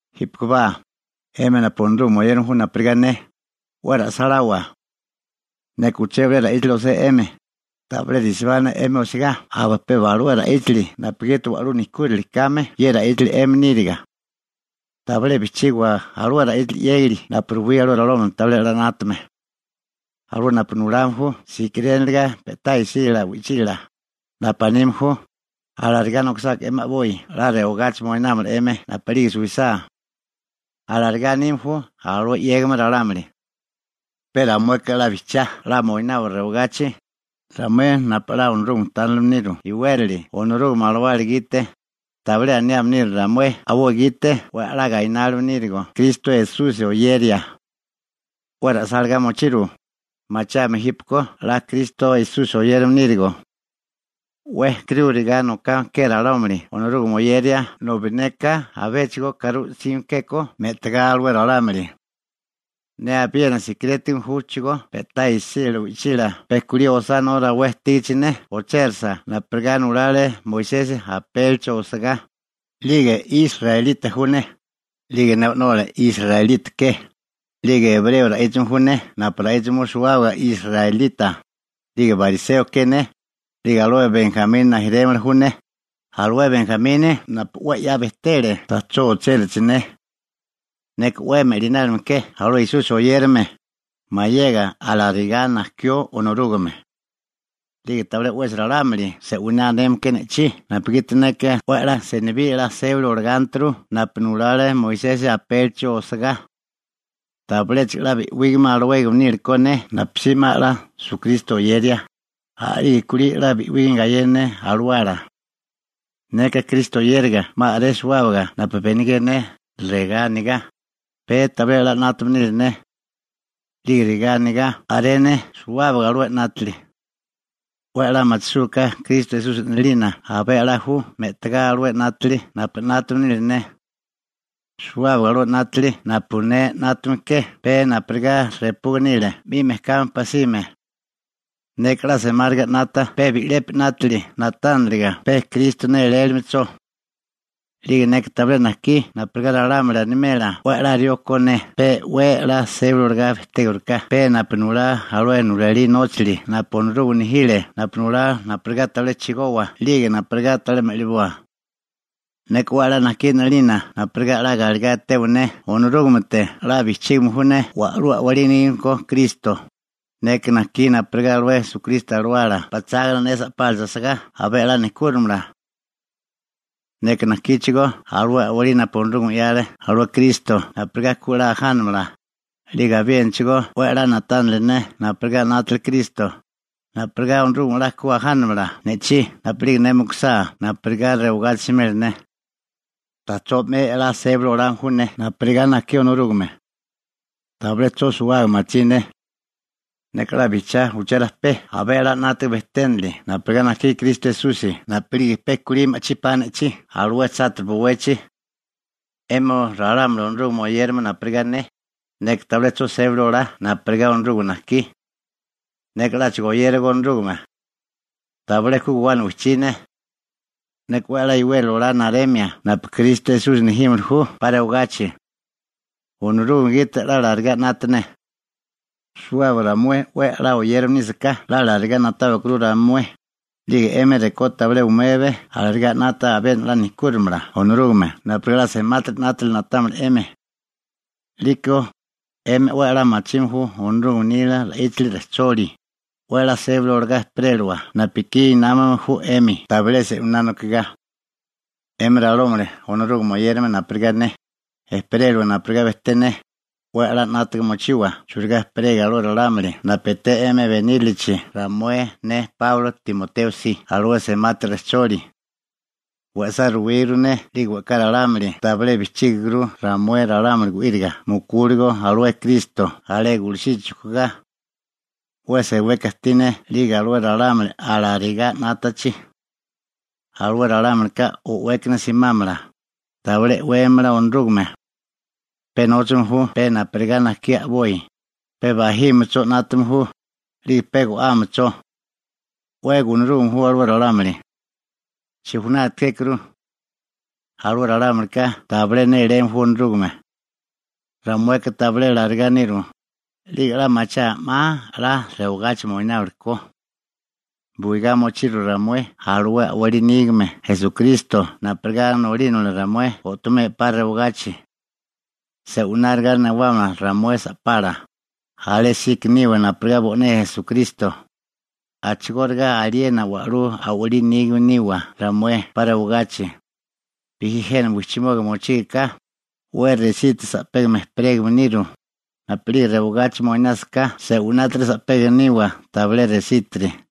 Jípekobá, 'emi napu Onorúgame oyérame ju napurigá ne, 'we ra'sáláwa. Neka uché bilé ra'íchali osé 'emi, tabilé resibá ne 'emi osegá aba pe alué ra'íchali napugiti wa'lú nejkúrali kame ye ra'íchali 'emi níriga. Tabilé bijchígawa alué ra'íchili 'yégali napu ruwí alué ralámuli tabilé 'la 'nátame. Alué napu nulame ju sikiréniliga pe'tá isílala wi'chila, napu anime ju: «Alarigá nokisáká 'emi a'boi 'la rewagachi moinámala 'emi napu'lige suwisá.» Alarigá anime ju alué 'yégame ralámuli. Pe ramueka 'la bijchiá 'la moinawa rewagachi, ramué napu 'la Onorúgame tánilime niru iwérali Onorúgame alawala gite, 'lige tabilé aniame niru ramué a'boi gite 'we 'la gainárime nírigo Kristo Esusi oyeria. 'We ra'sálagá mochiru, machiáame jípeko 'la Kristo Esusi oyérame nírigo. 'We e'karúriga nokame ke ralámuli Onorúgame oyeria nobi neka abéchigo e'karú 'sime kékó me'tagá alué ralámuli. Ne abiena sikirétigame júchigó pe'tá isílala wi'chila pe kulí osánó rawé ajtígachi ne ochérasa napurigá nulale Moisesi apélichi osagá, 'lige israelita ju ne, 'lige ne o'nola israelita ke, 'lige ebreo ra'íchame ju ne napu ra'íchame ju suwábaga israelita, 'lige bariseo ke ne, 'lige alué Benjamini rijimala ju ne, alué Benjamini napu 'we 'ya bejtele ta'chó ochérachi ne. Neka 'we me'linálime ke alué Esusi oyérame, mayega alarigá najkió Onorúgame. 'Lige tabilé 'wesi ralámuli se'winá aneme ke ne'chí napugiti neka 'we 'la senibí sébali olagánturu napu nulale Moisesi apélichi osagá. Tabiléchigo a'lá bi'wígame alawégame níliko ne napusí 'ma 'la Esukristo oyeria, a'lige kulí 'la bi'wígame gayena ne alawala. Neka Kristo oyériga 'ma a'ré suwábaga napu benigé ne regá anigá: «Pe tabilé 'la 'nátame nile ne.» 'Lige regá anigá a'ré ne suwábaga alué 'nátili: «'We a'lá machisúgaká Kristo Esusi 'nalina abé 'la ju me'tigá alué 'nátili napu 'nátame nile ne.» Suwábaga alué 'nátili napu ne 'nátame ke pe napurigá repuga nile 'mi mejkami pasime. Neka a'lá semáriga 'nata pe bi'lepi 'nátili na'tániliga pe Kristo nélélimecho. 'Lige neka tabilé najkí napurigá ralámuli animela 'we 'la rió ko ne pe 'we 'la sébali olagá bejtégiriká pe napu nulá alué nulalí nóchali napu Onorúgame nejile napu nulá napurigá tabilé chigowa 'lige napurigá tabilé me'liboa. Neka 'we 'la najkí 'nalina napurigá 'la galegá etewa ne Onorúgamete 'la bijchígame ju ne wa'lú a'walí nígame ko Kristo. Neka najkí napurigá alué Kristo Alawala pachágana ne sa'pálachi asagá abé a'lá nejkúrimala. Neka najkíchigó alué a'walí napu Onorúgame 'yale alué Kristo napurigá ku 'la ajánamala, 'lige abiénachigó 'we a'lá na'tánili ne napurigá 'nátale Kristo, napurigá Onorúgame 'la ku 'la ajánirimala ne'chí napu'lige ne mukusá napurigá rewagachi simela ne. Ta'chó 'me 'la sébali olame ju ne napurigá najkí Onorúgame. Tabilé 'cho suwábaga machí ne. Neka 'la bijchiá uché rajpé abé 'la 'nátaga bejténili napurigá najkile Kristo Esusi napu'lige pe kulí ma'chí pa ne'chí alué chátiri bowechi. 'Emi ralámuli Onorúgame oyérame napurigá ne, neka tabilé 'cho sébali olá napurigá Onorúgame najkí. Neka 'láchigo oyéragó Onorúgame. Tabilé ku guwana wijchí ne. Neka 'we 'la e'wérali olá naremia napu Kristo Esusi nejímili ju 'pa rewagachi. Onorúgame gite 'la alarigá 'nata ne. Suwábaga ramué 'we 'la oyérame nísaká 'la alarigá na'táwikuru ramué, 'lige 'emi rekó tabilé umebe alarigá 'nata abiena 'la nejkúrimala Onorúgame napurigá 'la semátiri 'nátili na'támala 'emi. 'Liko, 'emi 'we 'la machime ju Onorúgame nila ra'íchali rejcholi, 'we a'lá sébali olagá ejperélawa napu ekí námame ju 'emi tabilé se'winá nokigá. 'Emi ralámuli Onorúgame oyérame napurigá ne, ejperélawa napurigá bejté ne, 'we 'la 'nátaga mochiwa churigá ejperego alué ralámuli napu eté 'emi benírilichi ramué ne Páulo Timoteo si alué semati rejcholi. We'sá ruwíguru ne 'lige we'ká ralámuli tabilé bijchígiguru ramué ralámuli gu'íriga mukúligo alué Kristo alé gulusichi chujkugá. 'We seweka ajtí ne 'lige alué ralámuli alarigá 'nátachi. Alué ralámulika o'wékana simámala, tabilé e'weme Onorúgame. Pe nóchame ju pe napurigá najkí a'boi. Pe bajílimecho 'nátame ju, 'lige pe go'ámecho. 'We gunarúgame ju alué ralámuli. Chijunati kékuru. Alué ralámulika tabilé néléme ju Onorúgame. Ramueka tabilé alarigá niru, 'lige 'la machiaa 'ma 'la rewagachi moináwili ko. Buigá mochiru ramué alué a'wali nígame Esukristo napurigá nolínamala ramué o'tomea 'pa rewagachi. Se'wináriga newámala ramué sa'pala, alésíko niwa napurigá bo'né Esukristo, a'chigóriga aliena wa'lú a'walí nígame niwa ramué 'pa rewagachi. Bijí jena wijchimoba mochígaká, 'we resítiri sa'pega ejperégame niru, napu'lige rewagachi moinásiká se'winátiri sa'pégame niwa tabilé resítiri.